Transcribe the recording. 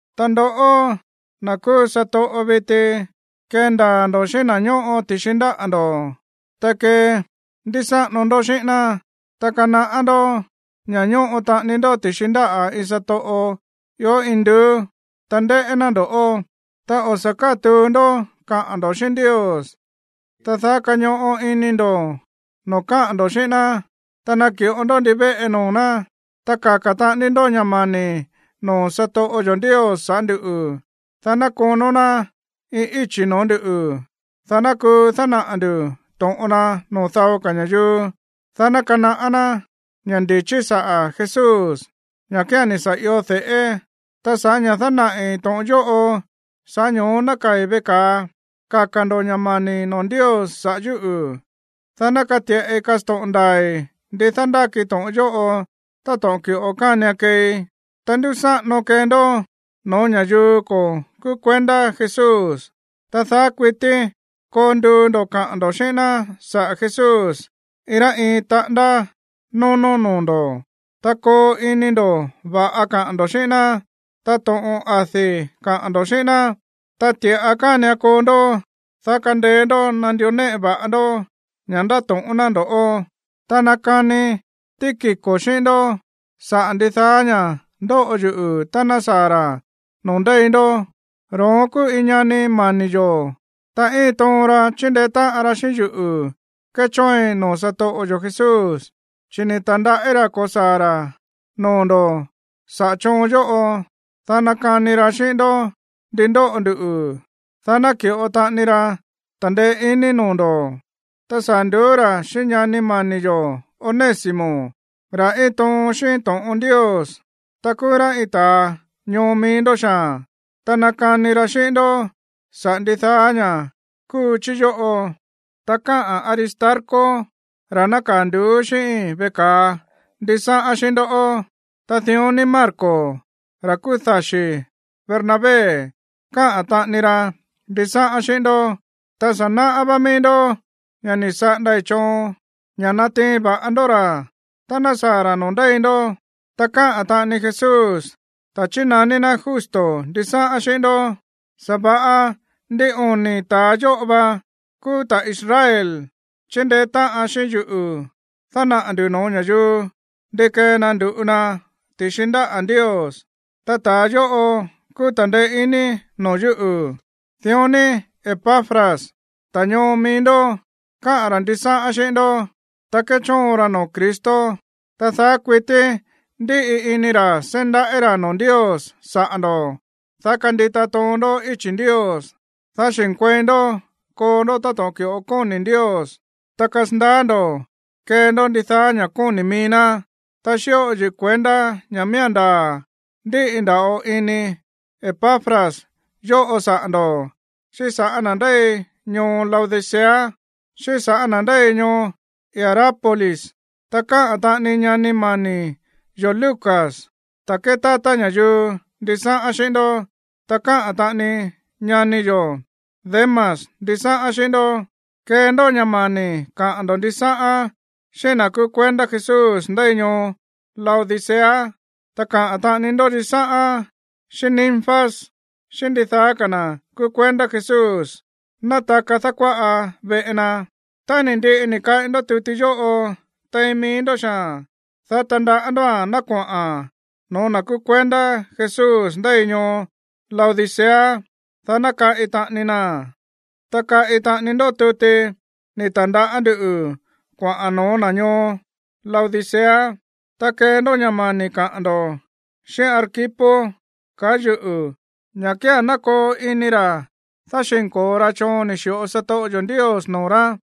Ta ndoꞌó, na̱ kúú satoꞌo viti, kendaa̱ ndo̱ xíꞌín na̱ ñóꞌo ti̱xi ndáꞌa̱ ndo̱, ta kendúsáꞌano ndó xíꞌín ná. Ta kanaꞌá ndó ña̱ ñóꞌo taꞌani ndó ti̱xi ndáꞌa̱ iin satoꞌo ió induú, ta ndéꞌé ná ndo̱ꞌó. Ta o̱ sa̱ kátuu ndó kaꞌa̱n ndo̱ xíꞌín Ndios, ta daá kañoꞌo ini ndo̱ noo̱ káꞌa̱n ndo̱ xíꞌín ná, ta naki̱ꞌo ndó ndivéꞌe noo̱ ná. Ta kaka̱ taꞌani ndó ña̱ mani̱ noo̱ satoꞌo yo̱ Ndios saꞌa̱ ndúꞌu̱, dá ná konó ná iin íchi̱ noo̱ ndúꞌu̱, dá ná kuu dánaꞌa̱ ndu̱ to̱ꞌon na noo̱ dao ka̱ ña̱yuu, dá ná kanaꞌá ná ña̱ ndi̱chí saꞌa̱ Jesús, ña̱ kía̱n ni̱ sa̱ io de̱ꞌé. Ta sa̱ꞌá ña̱ dánaꞌi̱ to̱ꞌon yóꞌo, sa̱ꞌá ño̱ó nákaa̱i̱ veꞌe ka̱a. Kaka̱ ndo̱ ña̱ mani̱ noo̱ Ndios saꞌa̱ yúꞌu̱, dá ná kati̱ꞌai kasto̱ꞌon ndaa̱i̱ ndi dándáki to̱ꞌon yóꞌo táto̱ꞌon ki̱ꞌo kánian keei. Ta ndúsáꞌano kee ndó no̱ó ña̱yuu ko̱ kúú kuendá Jesús, ta daá kuití koo nduu ndo̱ kaꞌa̱n ndo̱ xíꞌín ná saꞌa̱ Jesús iin rá iin taꞌándá nónó noo̱ ndo̱. Ta koo ini ndo̱ va̱ꞌa kaꞌa̱n ndo̱ xíꞌín ná, ta to̱ꞌon adi̱ kaꞌa̱n ndo̱ xíꞌín ná, ta ti̱ꞌa kánian koo ndó, dá kandeé ndó nandió néꞌe va̱ꞌa ndó ña̱ ndáto̱ꞌón ná ndo̱ꞌó. Ta nakani Tíquico xíꞌín ndó saꞌa̱ ndidaá ña̱ ndóꞌo yuꞌu̱ tá ná saa̱ ra̱ noo̱ ndéi ndó. Ro̱ón kúú iin ñani mani̱ yo̱, ta íin toon ra chíndeé táꞌan ra xíꞌín yuꞌu̱ kéchóoin noo̱ satoꞌo yo̱ Jesús. Chi̱ ni̱ ta̱ndaꞌí ra̱ ko̱saa̱ ra̱ noo̱ ndo̱ saꞌa̱ choon yóꞌo, dá nakani ra xíꞌín ndó ndi ndóꞌo ndu, dá ná ki̱ꞌo taꞌani ra ta̱ndeé iní noo̱ ndo̱. Ta saa̱ nduú ra̱ xíꞌín ñani mani̱ yo̱ Onésimo, ra̱ íin toon xíꞌín to̱ꞌon Ndios, ta kúú rá iin ta̱a ñoo mií ndó xaa̱n. Ta nakani ra xíꞌín ndó saꞌa̱ ndidaá ña̱ kúu chí yóꞌo. Ta káꞌa̱n Aristarco, ra̱ nákaa̱ nduú xíꞌíi̱n veꞌe ka̱a, ndisáꞌán xíꞌín ndó. Ta dión ni Marcos, ra̱ kúú daxi̱ Bernabé, káꞌa̱n taꞌani ra ndisáꞌán xíꞌín ndó. Ta sa̱ náꞌá vá míí ndó ña̱ ni̱ saꞌandai̱ choon ña̱ natiin va̱ꞌa ndó ra̱ tá ná saa̱ ra̱ noo̱ ndéi ndó. Ta káꞌa̱n taꞌani Jesús, ta̱a chínaní ná Justo, ndisáꞌán xíꞌín ndó. Sa̱va̱ꞌa ndin oni̱ ta̱a yóꞌo va kúú ta̱ Israel chíndeé táꞌan xíꞌín yuꞌu̱ dánaꞌa̱ ndu̱ no̱ó ña̱yuu ndi kee na ndu̱ꞌu na ti̱xi ndáꞌa̱ Ndios. Ta ta̱a yóꞌo kúú ta̱ndeé iní noo̱ yúꞌu̱. Dión ni Epafras, ta̱a ñoo mií ndó, káꞌa̱n ra̱ ndisáꞌán xíꞌín ndó, ta kéchóon ra noo̱ Cristo. Ta daá kuití ndíꞌi ini ra̱ seí ndaꞌí ra̱ noo̱ Ndios saꞌa̱ ndo̱, dá kandita toon ndó íchi̱ Ndios, dá xi̱nkuei ndó koo ndó táto̱ꞌon ki̱ꞌo kóni̱ Ndios, ta kasandaá ndo̱ kee ndó ndidaá ña̱ kóni̱ mií ná. Ta xíꞌo yuꞌu̱ kuendá ña̱ miía̱n ndaa̱ ndíꞌi nda̱ꞌo ini Epafras yóꞌo saꞌa̱ ndo̱, xíꞌín sa̱ꞌá na̱ ndéi ñoo Laodicea xíꞌín sa̱ꞌá na̱ ndéi ñoo Hierápolis. Ta káꞌa̱n taꞌani ñani mani̱ yo̱ Lucas, ta̱a kétátá ña̱yuu, ndisáꞌán xíꞌín ndó. Ta káꞌa̱n taꞌani ñani yo̱ Demas ndisáꞌán xíꞌín ndó. Kee ndó ña̱ mani̱ kaꞌa̱n ndo̱ ndisáꞌán xíꞌín na̱ kúú kuendá Jesús ndéi ñoo Laodicea, ta kaꞌa̱n taꞌani ndó ndisáꞌán xíꞌín Ninfas, xíꞌín ndidaá ka̱ na̱ kúú kuendá Jesús nátaka dákuáꞌa veꞌe na. Tá ni̱ ndiꞌi ni̱ kaꞌi ndó tuti yóꞌo tein mií ndó xaa̱n, dá tandaꞌá ndóa̱n ná koꞌa̱n no̱ó na̱ kúú kuendá Jesús ndéi ñoo Laodicea, dá ná kaꞌi taꞌani naa̱n. Ta kaꞌi taꞌani ndó tuti ni̱ ta̱ndaꞌá ndú kuaꞌa̱n no̱ó na̱ ñoo Laodicea. Ta kee ndó ña̱ mani̱ kaꞌa̱n ndo̱ xíꞌín Arquipo, kaá yuꞌu̱, ña̱ kía̱n ná koo ini ra̱ dáxi̱nko̱o ra choon ni̱ xi̱ꞌo satoꞌo yo̱ Ndios noo̱ rá.